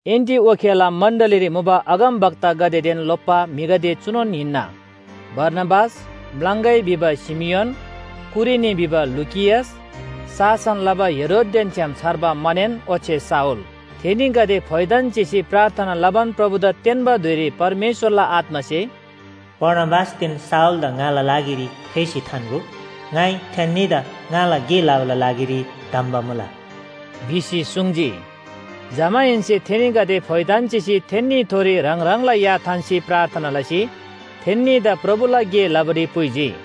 एन्‍टिओखियाला मण्‍डलीरी मुबा अगमवक्तागदेदेन लोप्‍बा म्‍हिगदे चुनोन हिन्‍ना। बारनाबास, म्‍लाङगै भिबा शिमियोन, कुरेनी भिबा लुकियस, शासन लबा हेरोददेन छ्‌याम छर्बा मनेन ओच्‍छे शाऊल, थेनीगदे फोइथान चिसी प्रार्थना लबान प्रभुदा तेन्‍बा धुइरी परमेश्‍वरला आत्‍मासे “बारनाबासदेन शाऊलदा ङाला लागिरी फेसी थान्‍गो, ङाइ थेन्‍नीदा ङाला गे लबाला लागिरी धम्‍बा मुला” भिसी सुङ्जी। जमाहेन्‍से थेनीगदे फोइथान चिसी थेन्‍नीथोरी ह्राङ ह्राङला या थान्‍सी प्रार्थना लसी थेन्‍नीदा प्रभुला गे लबारी पुइजी।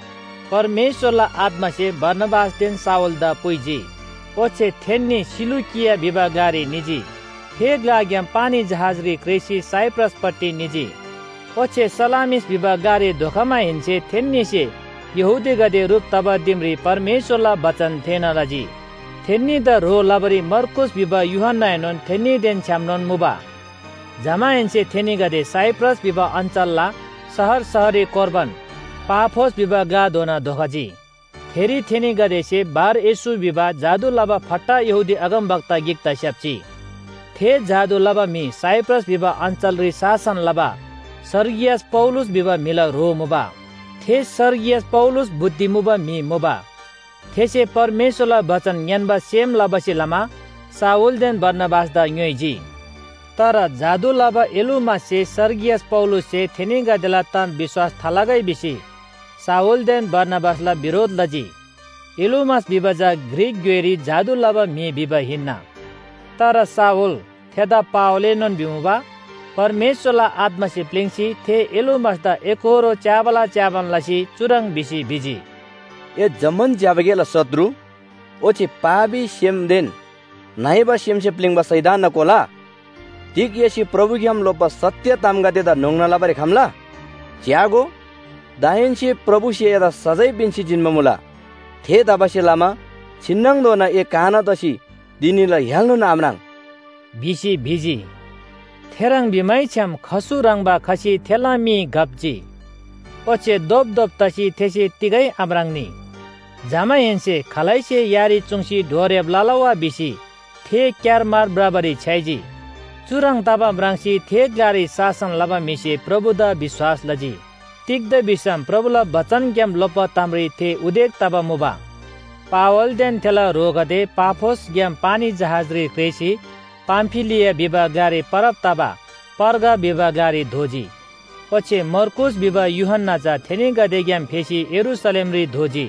परमेश्‍वरला आत्‍मासे बारनाबासदेन शाऊलदा पुइजी, ओच्‍छे थेन्‍नी सिलुकिया भिबा ग्‍लारी निजी। थे ग्‍लाग्‍याम पानी जहाजरी क्रेःसी साइप्रसपट्टि निजी। ओच्‍छे सलामिस भिबा ग्‍लारी धोखमाहेन्‍से थेन्‍नीसे यहूदीगदे ह्रुप तबा दिमरी परमेश्‍वरला बचन थेःना लजी। थेन्‍नीदा ह्रो लबारी मर्कूस भिबा यूहन्‍नाएनोन थेन्‍नीदेन छ्‌यामनोन मुबा। जमाहेन्‍से थेनीगदे साइप्रस भिबा अञ्‍चलला शहर शहररी कोर्बान पाफोस भिबा ग्‍लाधोना धोखजी, थेरी थेनीगदेसे बार-येशू भिबा जादु लबा फट्टा यहूदी अगमवक्ता गिकदा स्‍याप्‍जी। थे जादु लबा म्‍हि साइप्रस भिबा अञ्‍चलरी शासन लबा सर्गियस पौलुस भिबा म्‍हिला ह्रो मुबा। थे सर्गियस पौलुस बुद्धि मुबा म्‍हि मुबा। थेसे परमेश्‍वरला बचन ङ्‌यान्‍बा सेम लबासे लमा शाऊलदेन बारनाबासदा ङ्‌योइजी। तर जादु लबा एलुमाससे सर्गियस पौलुससे थेनीगदेला ताम विश्‍वास थालगै भिसी शाऊलदेन बारनाबासला बिरोध लजी। एलुमास भिबा चा ग्रीक ग्‍योइरी जादु लबा म्‍हि भिबा हिन्‍ना। तर शाऊल, थेदा पावलएनोन भिमुबा, परमेश्‍वरला आत्‍मासे प्‍लिङ्‌सी थे एलुमासदा एकोहोरो च्‍याबाला च्‍याबान लसी चुह्रङ् भिसी भिजी, “ए जम्‍मान ज्‍यबा गेला शत्रु, ओच्‍छे पापी सेमदेन नइबा सेमसे प्‍लिङ्बा शैतानना कोला, तिग एसे प्रभुग्‍याम लोप्‍बा सत्‍य तामगदेदा न्‍होङ्ना लबारी आख्‍ला? च्‍यागो, दाहेन्‍से प्रभुसे एदा सजाय पिन्‍सी जिन्‍बा मुला, थेतबासेलमा छिन्‍नङधोना ए काना तसी धिनीला य्‍हालएनोन आम्राङ्” भिसी भिजी। थेह्रङ् भिमैछ्‌याम खसु ह्रङ्‌बा खसी थेला मी घप्‍जी, ओच्‍छे धोपधोप तसी थेसे तिगै आम्राङ्‌नी। जमाहेन्‍से खालैसे यारी चुङ्सी डोर्‍याब लला वा भिसी थे क्‍यारमार भ्रबारी छ्‌याइजी। चुह्रङ् तबा म्राङ्सी थे ग्‍लारी शासन लबा म्‍हिसे प्रभुदा विश्‍वास लजी। तिग्‍दा भिसम प्रभुला बचनग्‍याम लोप्‍बा तामरी थे उदेक तबा मुबा। पावलदेन थेला ह्रोगदे पाफोसग्‍याम पानी जहाजरी क्रेःसी पामफिलिया भिबा ग्‍लारी परब तबा पर्गा भिबा ग्‍लारी धोजी, ओच्‍छे मर्कूस भिबा यूहन्‍ना चा थेनीगदेग्‍याम फेसी यरूशलेमरी धोजी।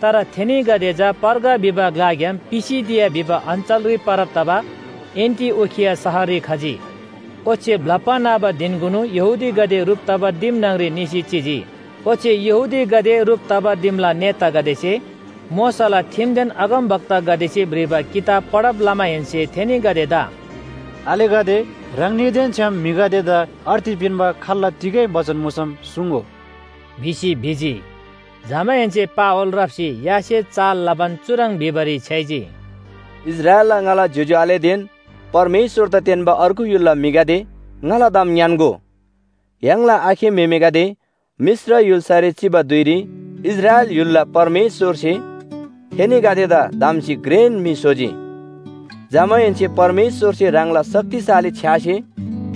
तर थेनीगदे चा पर्गा भिबा ग्‍लाग्‍याम पिसिदिया भिबा अञ्‍चलरी परब तबा एन्‍टिओखिया शहररी खजी, ओच्‍छे ब्‍लप्‍बा न्‍हबा धिनकुनु यहूदीगदे ह्रुप तबा दिम न्‍हङरी निसी चिजी। ओच्‍छे यहूदीगदे ह्रुप तबा दिमला नेतागदेसे मोशाला ठिमदेन अगमवक्तागदेसे भ्रिबा किताब पढब लमाहेन्‍से थेनीगदेदा “आलेगदे, ह्राङनीदेन छ्‌याम म्‍हिगदेदा अर्ती पिन्‍बा खाल्‍ला तिगै बचन मुसम सुङ्‍गो” भिसी भिजी। जमाहेन्‍से पावल राप्‍सी यासे चाल लबान चुह्रङ् भिबारी छ्‌याइजी, “इस्राएलला ङाला ज्‍योज्‍यो आलेदेन परमेश्‍वरदा तेन्‍बा अर्गु य्‍हुलला म्‍हिगदे ङाला ताम ङ्‌यान्‍गो। य्‍हाङला आखे म्‍हेमेगदे मिश्र य्‍हुल्‍सारी चिबा धुइरी इस्राएल य्‍हुलला परमेश्‍वरसे थेनीगदेदा धम्‍सी घ्रेन म्‍हि स्‍होजी। जमाहेन्‍से परमेश्‍वरसे ह्राङला शक्तिशाली छ्‌यासे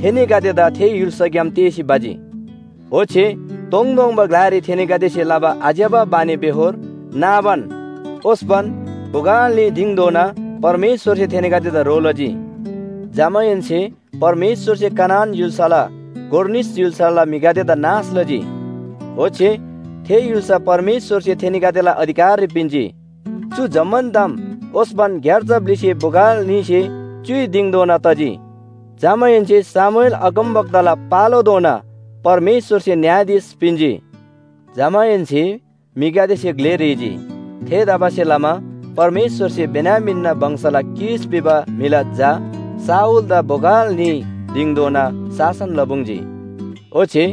थेनीगदेदा थे य्‍हुल्‍साग्‍याम तेःसी भजी। ओच्‍छे तोङतोङबा ग्‍लारी थेनीगदेसे लबा आज्‍यबा बानीबेहोर नाबान ओस्‍पन बोगल न्‍ही दिङधोना परमेश्‍वरसे थेनीगदेदा ह्रो लजी। जमाहेन्‍से परमेश्‍वरसे कनान य्‍हुल्‍साला गोर निस य्‍हुलला म्‍हिगदेदा नाश लजी। ओच्‍छे थे य्‍हुल्‍सा परमेश्‍वरसे थेनीगदेला अधिकाररी पिन्‍जी। चु जम्‍मान ताम ओस्‍पन ग्‍यार्जा ब्‍लिसे बोगल न्‍हीसे च्‍युइ दिङधोना तजी। “जमाहेन्‍से शमूएल अगमवक्ताला पालोधोना परमेश्‍वरसे न्‍यायाधीश पिन्‍जी। जमाहेन्‍से म्‍हिगदेसे ग्‍ले ह्रीजी, थेतबासेलमा परमेश्‍वरसे बेन्‍यामीनना वंशला कीश भिबा म्‍हिला झा शाऊलदा बोगल न्‍ही दिङधोना शासन लपुङ्‌जी। ओच्‍छे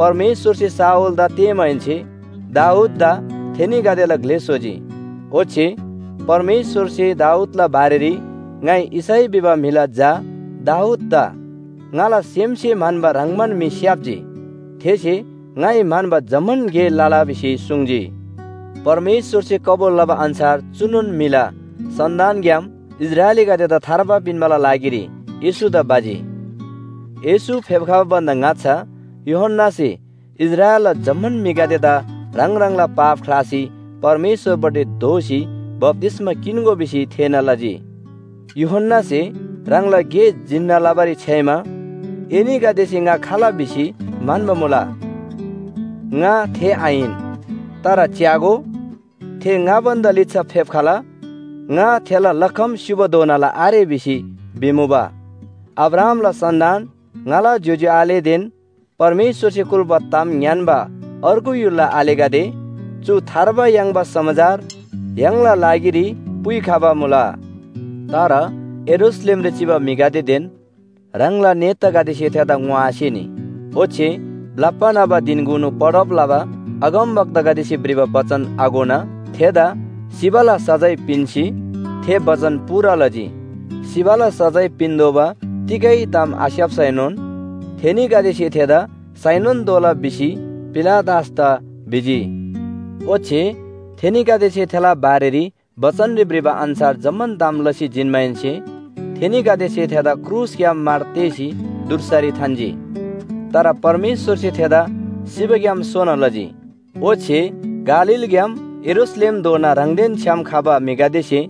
परमेश्‍वरसे शाऊलदा तेःमाहेन्‍से दाऊददा थेनीगदेला ग्‍ले स्‍होजी। ओच्‍छे परमेश्‍वरसे दाऊदला बारेरी ‘ङाइ यिशै भिबा म्‍हिला झा दाऊददा ङाला सेमसे म्‍हन्‍बा ह्रङ्‌बान म्‍हि स्‍याप्‍जी, थेसे ङाइ म्‍हन्‍बा जम्‍मान गे लला’ भिसी सुङ्जी। “परमेश्‍वरसे कबुल लबा अन्‍छार चुनोन म्‍हिला सन्‍तानग्‍याम इस्राएलीगदेदा थार्बा पिन्‍बाला लागिरी येशूदा भजी। येशू फेप्‍खबा भन्‍दा ङाच्‍छा यूहन्‍नासे इस्राएलला जम्‍मान म्‍हिगदेदा ह्राङ ह्राङला पाप ख्‍लासी परमेश्‍वरपट्टि दोःसी बप्‍तिस्‍मा किन्‍गो भिसी थेःना लजी। यूहन्‍नासे ह्राङला गे जिन्‍ना लबारी छ्‌याइमा ‘एनीगदेसे ङा खाल भिसी म्‍हन्‍बा मुला? ङा थे आहिन। तर च्‍यागो, थे ङा भन्‍दा लिच्‍छा फेप्‍खला, ङा थेला लखम स्‍युबाधोनाला आरे’ भिसी भिमुबा। “अब्राहामला सन्‍तान, ङाला ज्‍योज्‍यो आलेदेन परमेश्‍वरसे कुल्‍बा ताम ङ्‌यान्‍बा अर्गु य्‍हुलला आलेगदे चु थार्बा याङ्बा समाचार य्‍हाङला लागिरी पुइखबा मुला। तर यरूशलेमरी चिबा म्‍हिगदेदेन ह्राङला नेतागदेसे थेदा ङोआसेनी, ओच्‍छे ब्‍लप्‍बा न्‍हबा धिनकुनु पढब लबा अगमवक्तागदेसे भ्रिबा बचन आघोना थेदा सिबाला सजाय पिन्‍सी थे बचन पूरा लजी। सिबाला सजाय पिन्‍तोःबा तिगै ताम आस्‍याप्‍सैनोन थेनीगदेसे थेदा साइनोन तोःला भिसी पिलातसदा भिजी। ओच्‍छे थेनीगदेसे थेला बारेरी बचनरी भ्रिबा अन्‍छार जम्‍मान ताम लसी जिन्‍माहेन्‍से थेनीगदेसे थेदा क्रुसग्‍याम मार तेःसी धुर्सारी थान्‍जी। तर परमेश्‍वरसे थेदा सिबाग्‍याम सोना लजी। ओच्‍छे गालीलग्‍याम यरूशलेमधोना ह्राङदेन छ्‌याम खबा म्‍हिगदेसे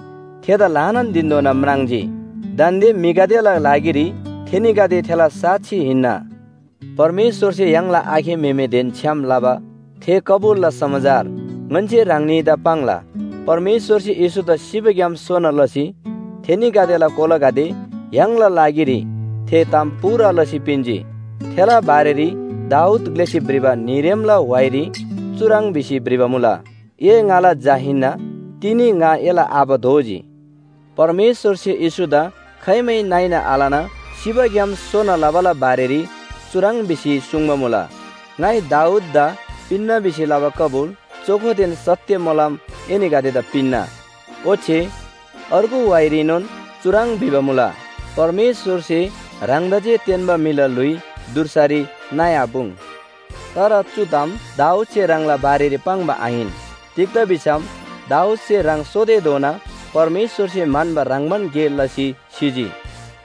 थेदा ल्‍हानान धिनधोना म्राङ्जी, दान्‍दे म्‍हिगदेला लागिरी थेनीगदे थेला साक्षी हिन्‍ना। “परमेश्‍वरसे य्‍हाङला आखे म्‍हेमेदेन छ्‌याम लबा थे कबुलला समाचार ङन्‍से ह्राङनीदा पाङ्ला। परमेश्‍वरसे येशूदा सिबाग्‍याम सोना लसी थेनीगदेला कोलागदे य्‍हाङला लागिरी थे ताम पूरा लसी पिन्‍जी, थेला बारेरी दाऊद ग्‍लेसे भ्रिबा न्‍हीरेमला व्‍हाइरी चुह्रङ् भिसी भ्रिबा मुला ‘ए ङाला झा हिन्‍ना, तिनी ङा एला आबा दोजी।’ परमेश्‍वरसे येशूदा खाइमै नइना आलना सिबाग्‍याम सोना लबाला बारेरी चुह्रङ् भिसी सुङ्बा मुला, ‘ङाइ दाऊददा पिन्‍ना भिसी लबा कबुल चोखोदेन सत्‍य मोलम एनीगदेदा पिन्‍ना।’ ओच्‍छे अर्गु व्‍हाइरीनोन चुह्रङ् भिबा मुला, ‘परमेश्‍वरसे ह्राङदा जे तेन्‍बा म्‍हिला ल्‍हुइ धुर्सारी नइआपुङ्।’ तर चु ताम दाऊदसे ह्राङला बारेरी पाङ्बा आहिन। तिग्‍दा भिसम दाऊदसे ह्राङ सोतेधोना परमेश्‍वरसे म्‍हन्‍बा ह्रङ्‌बान गे लसी सिजी।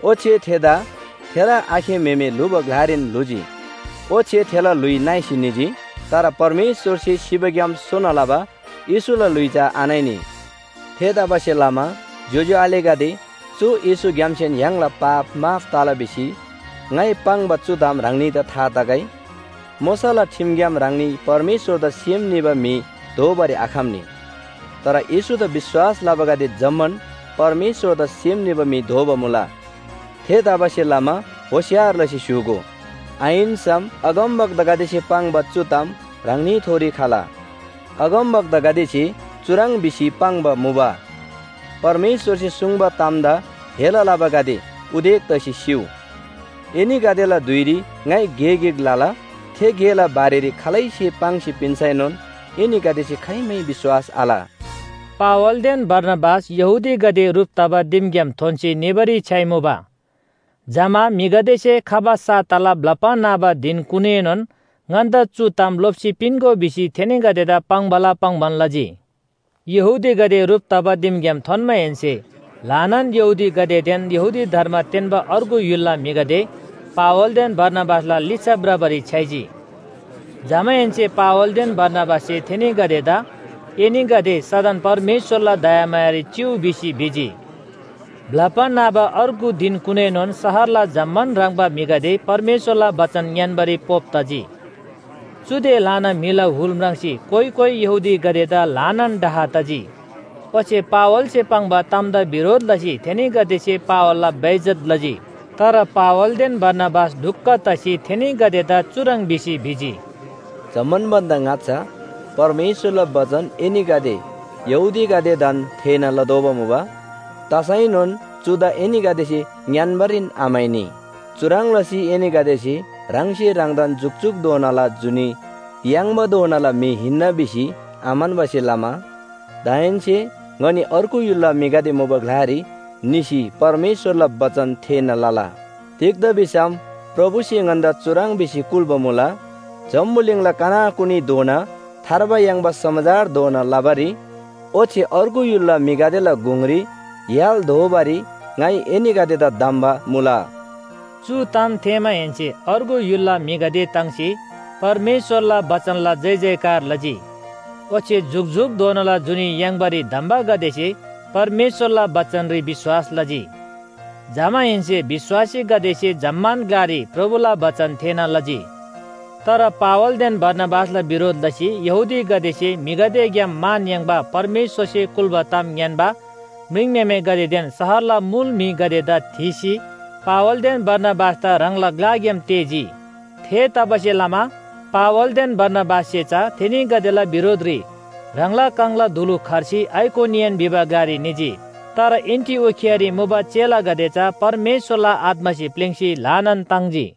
ओच्‍छे थेदा थेला आखे म्‍हेमे ल्‍हुबा ग्‍लारीन ल्‍हुजी, ओच्‍छे थेला ल्‍हुइ नइसी निजी। तर परमेश्‍वरसे सिबाग्‍याम सोना लबा येशूला ल्‍हुइ चा आनइनी। “थेतबासेलमा ज्‍योज्‍यो आलेगदे चु येशूग्‍यामसेन य्‍हाङला पाप माफ तला भिसी ङाइ पाङ्बा चु ताम ह्राङनीदा था तगै। मोशाला ठिमग्‍याम ह्राङनी परमेश्‍वरदा सेम निबा म्‍हि दोबारी आखम्‍नी। तर येशूदा विश्‍वास लबागदे जम्‍मान परमेश्‍वरदा सेम निबा म्‍हि दोबा मुला। थेतबासेलमा होशियार लसी स्‍य्‍हूगो, आहिन्‍सम अगमवक्तागदेसे पाङ्बा चु ताम ह्राङनीथोरी खला। अगमवक्तागदेसे चुह्रङ् भिसी पाङ्बा मुबा, ‘परमेश्‍वरसे सुङ्बा तामदा हेला लबागदे, उदेक तसी सिउ! एनीगदेला धुइरी ङाइ गे गिक लला, थे गेला बारेरी खालैसे पाङ्सी पिन्‍सैनोन एनीगदेसे खाइमै विश्‍वास आल।’” पावलदेन बारनाबास यहूदीगदे ह्रुप तबा दिमग्‍याम थोन्‍सी निबारी छ्‌याइमुबा, जमा म्‍हिगदेसे खबा साताला ब्‍लप्‍बा न्‍हबा धिनकुनुएनोन ङन्‍दा चु ताम लोप्‍सी पिन्‍गो भिसी थेनीगदेदा पाङ्‌बाला पाङ्‌बान लजी। यहूदीगदे ह्रुप तबा दिमग्‍याम थोन्‍माहेन्‍से ल्‍हानान यहूदीगदेदेन यहूदी धर्म तेन्‍बा अर्गु य्‍हुलला म्‍हिगदे पावलदेन बारनाबासला लिच्‍छा भ्रबारी छ्‌याइजी, जमाहेन्‍से पावलदेन बारनाबाससे थेनीगदेदा एनीगदे सदन परमेश्‍वरला दयामायारी चिउ भिसी भिजी। ब्‍लप्‍बा न्‍हबा अर्गु धिनकुनुएनोन शहरला जम्‍मान ह्रङ्‌बा म्‍हिगदे परमेश्‍वरला बचन ङ्‌यान्‍बारी पोप तजी। चुदे ल्‍हाना म्‍हिला हुल म्राङ्सी कोइ कोइ यहूदीगदेदा ल्‍हानान डाह तजी, ओच्‍छे पावलसे पाङ्बा तामदा बिरोध लसी थेनीगदेसे पावलला बेइज्‍जत लजी। तर पावलदेन बारनाबास ढुक्‍क तसी थेनीगदेदा चुह्रङ् भिसी भिजी, “जम्‍मान भन्‍दा ङाच्‍छा परमेश्‍वरला बचन एनीगदे यहूदीगदेदान थेःना लतोःबा मुबा। तसैनोन चुदा एनीगदेसे ङ्‌यान्‍बारीन आम्‍हाइनी। चुह्रङ् लसी एनीगदेसे ह्राङसे ह्राङदा जुकजुकधोनाला जुनी याङ्‍बाधोनाला म्‍हि हिन्‍ना भिसी आम्‍हन्‍बासे लमा दाहेन्‍से ङनी अर्गु य्‍हुलला म्‍हिगदे मुबा ग्‍लारी निसी परमेश्‍वरला बचन थेःना लला। तिग्‍दा भिसम प्रभुसे ङन्‍दा चुह्रङ् भिसी कुल्‍बा मुला, ‘जम्‍बुलिङला कनाकुनीधोना थार्बा याङ्बा समाचार धोना लबारी ओच्‍छे अर्गु य्‍हुलला म्‍हिगदेला गुङरी य्‍हाल दोबारी ङाइ एनीगदेदा धम्‍बा मुला।’” चु ताम थेःमाहेन्‍से अर्गु य्‍हुलला म्‍हिगदे ताङ्सी परमेश्‍वरला बचनला जयजयकार लजी, ओच्‍छे जुकजुकधोनाला जुनी याङ्बारी धम्‍बागदेसे परमेश्‍वरला बचनरी विश्‍वास लजी। जमाहेन्‍से विश्‍वासीगदेसे जम्‍मान ग्‍लारी प्रभुला बचन थेःना लजी। तर पावलदेन बारनाबासला बिरोध लसी यहूदीगदेसे म्‍हिगदेग्‍याम मान याङ्बा परमेश्‍वरसे कुल्‍बा ताम ङ्‌यान्‍बा म्रिङम्‍हेमेगदेदेन शहरला मुल म्‍हिगदेदा थीसी, पावलदेन बारनाबासदा ह्राङला ग्‍लाग्‍याम तेःजी। थेतबासेलमा पावलदेन बारनाबाससे चा थेनीगदेला बिरोधरी ह्राङला काङला धुलु खर्सी आइकोनियन भिबा ग्‍लारी निजी। तर एन्‍टिओखियारी मुबा चेलागदे चा परमेश्‍वरला आत्‍मासे प्‍लिङ्‌सी ल्‍हानान ताङ्जी।